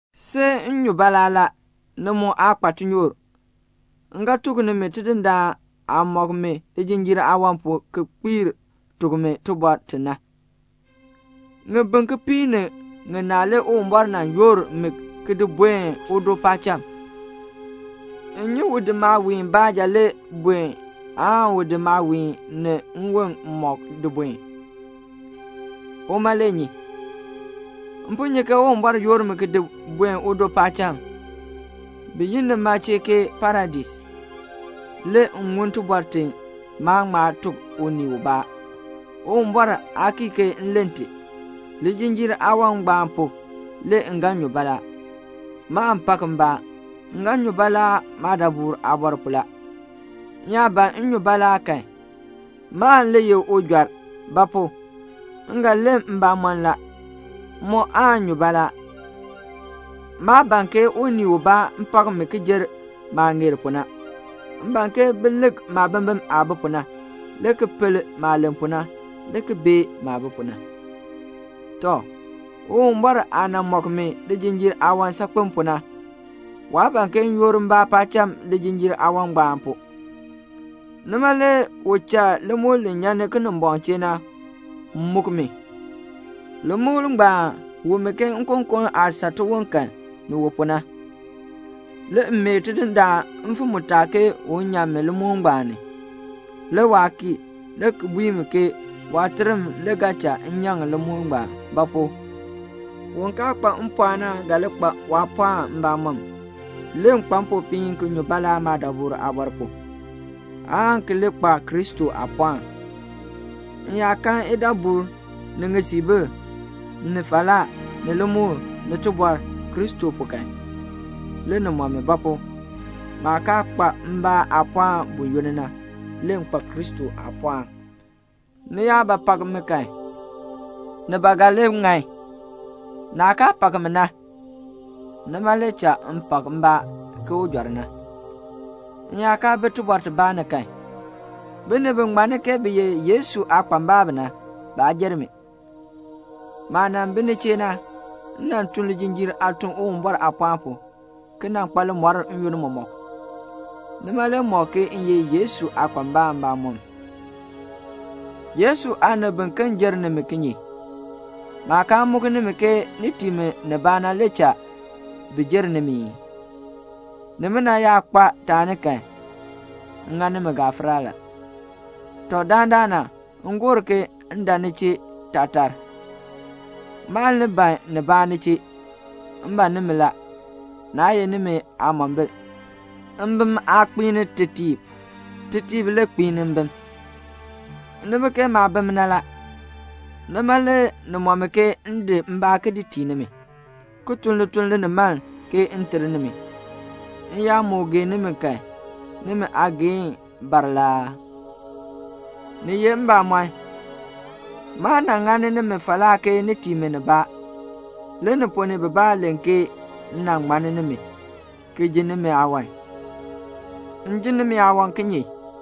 See m nyu baalaa la. Ni mu aa kpa tinyoor. M ga tuk nimi Tidindaan aah mɔk mi lijinjiir aawan pu ki kpiir tuk mi tibɔr ti na. Ŋibin kipiik ni ŋinaa le Uwumbɔr nan yoor mi ki di buen udo paacham. M nyi u di maawiin baanja le buen aan u di maawiin ni nwon mɔk di buen. Uma le nyi. M po nyi ke Uwumbɔr yoor mi ki di buen udo paacham, bi yi nima chee ke Paradais. Le m ŋun tibɔr ti maan ŋma tuk unii ubaa. Uwumbɔr aa kii ke m len ti. Lijinjiir aawan ngbaan pu, le m ga nyu baalaa. Maan pak mbaa, m ga nyu baalaa maadabur aabɔr pu la. M yaa ban m nyu baalaa kan, maan le ye ujɔr; ba pu? m ga len mbamɔn la. M mu aan nyu baalaa. Maa ban ke unii ubaa pak mi ki jer maah ŋeer pu na. M ban ke bi lik maabimbin aah bi pu na, le ki pel maah len pu na, le ki bee maah bi pu na. Tɔ, Uwumbɔr aah nan mɔk mi lijinjiir aawan saakpen pu na, waa ban ke m yoor mbaa paacham lijinjiir aawan ngbaan pu. Nima le u cha limukl li nyan ni Kinimbɔŋ chee na muk mi. Limukl ngbaan wu mi ke nkokon aah saa tiwon kan, ni wu pu na. Le m mee Tidindaan mfim mutaa ke un nyan mi limukl ngbaan ni. Le waa kii, le ki bui mi ke waaterm le ga cha m nyaŋ limukl ngbaan; ba pu? un kaa kpa mpɔɔn na ga li kpa waapɔɔn mbamɔm. Le m kpa mpopiin ki nyu baalaa maadabur aabɔr pu, aan ki li kpa Kristo aapɔɔn. M yaa kan idabur, ni ŋisiibil, ni falaa, ni limukl, ni tibɔr, Kristo pu kan, le ni mɔ mi; ba pu? maah kaa kpa mbaa aapɔɔn buyoonn na, le m kpa Kristo aapɔɔn. Ni yaa ba pak mi kan, ni ba ga li ŋan. Naah kaa pak mi na, nima le cha m pak mbaa ke ujɔr na. M yaa kaa bi tibɔr tibaa ni kan, binib bi ŋmanni ke bi ye Yesu aakpambalb na, baa jer mi. Maah nan bi ni chee na, m nan tun lijinjiir aatun Uwumbɔr aapɔɔn pu, ki nan kpa limɔr n-yoonn mɔmɔk. Nima le mɔk ke m ye Yesu aakpambalb mbamɔm. Yesu aanib biken jer nimi kinye? Maah kaa muk nimi ke ni tii mi nibaa na le cha bi jer nimi ii? Nimina yaa kpa taani kan, m ŋa nimi gafara la. Tɔ, dandana m gor ke m dan ni chee taatar. Maan li ban nibaa ni chee. M ban nimi la, naa ye nimi aamombil. Mbim aa kpiini tetiib. Tetiib le kpiini mbim. Ni bi ke maabim na la. Nima le ni mɔ mi ke m di mbaa ki di tii nimi, ki tun lituln linimaln ke m ter nimi. M yaa moo gee nimi kan, nimi aageehn bar la aa? Ni ye mbamɔn, maa nan ŋani nimi falaa ke ni tii mi nibaa. Le ni ponn ni bibaa len ke m nan ŋmann nimi, ki ji nimi aawan. M ji nimi aawan kinye?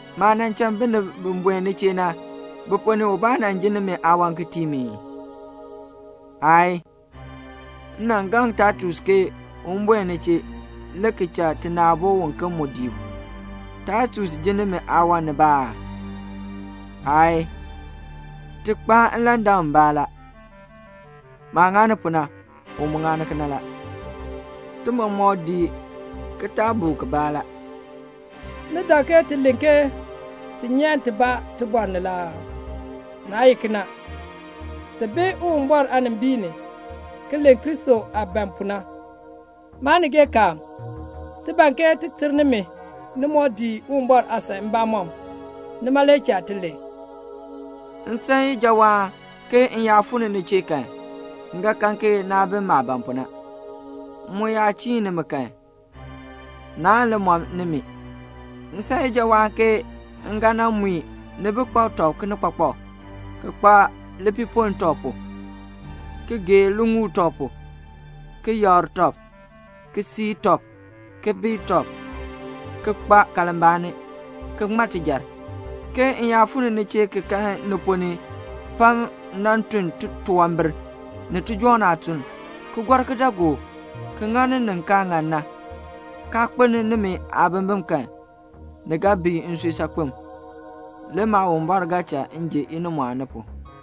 Maah nan cha binib buen ni chee na, bi ponn ni ubaa nan jin nimi aawan ki tii mi ii? Aayii. M nan gaŋ Taitus ke un buen ni chee, le ki cha tina aabo uken mu dii u. Taitus jin nimi aawan nibaa aa? Aayii. Ti kpaan nlandak mbaa la. Maah ŋani pu na, u mu ŋani kena la. Ti mɔmɔk dii kitaabuk kibaa la. Ni dak ke ti len ke ti nyan tibaa tibɔr ni la aa? Naa ye kena. Ti bi Uwumbɔr aanimbiin ni ki len Kristo aah ban pu na. Maanigeekaan, ti ban ke ti ter nimi ni moo dii Uwumbɔr aasan mbamɔm. Nima le cha ti len. M san ijawaan ke m yaa fuu ni ni chee kan, m ga kan ke naa bi maah ban pu na. M mu yaa chiin nimi kan, naan li mɔ nimi. M san ijawaan ke m ga nan mui ni bi kpak tɔb kinikpakpak, ki kpa lipiipoln tɔb pu, ki gee liŋuul tɔb pu, ki yakr tɔb, ki sii tɔb, ki bii tɔb, ki kpa kalmbaani, ki ŋma tijar, ke m yaa fuu ni ni chee ki kan ni ponn ni pam nan tun titunwambir, ni tijɔŋ aatuln, ki gɔr kidaagook, ki ŋani nin kaa ŋan na, kaa kpeln nimi aabimbin kan, ni ga bii nsui saakpen. Le Maawumbɔr ga cha m ji inimɔɔn ni pu.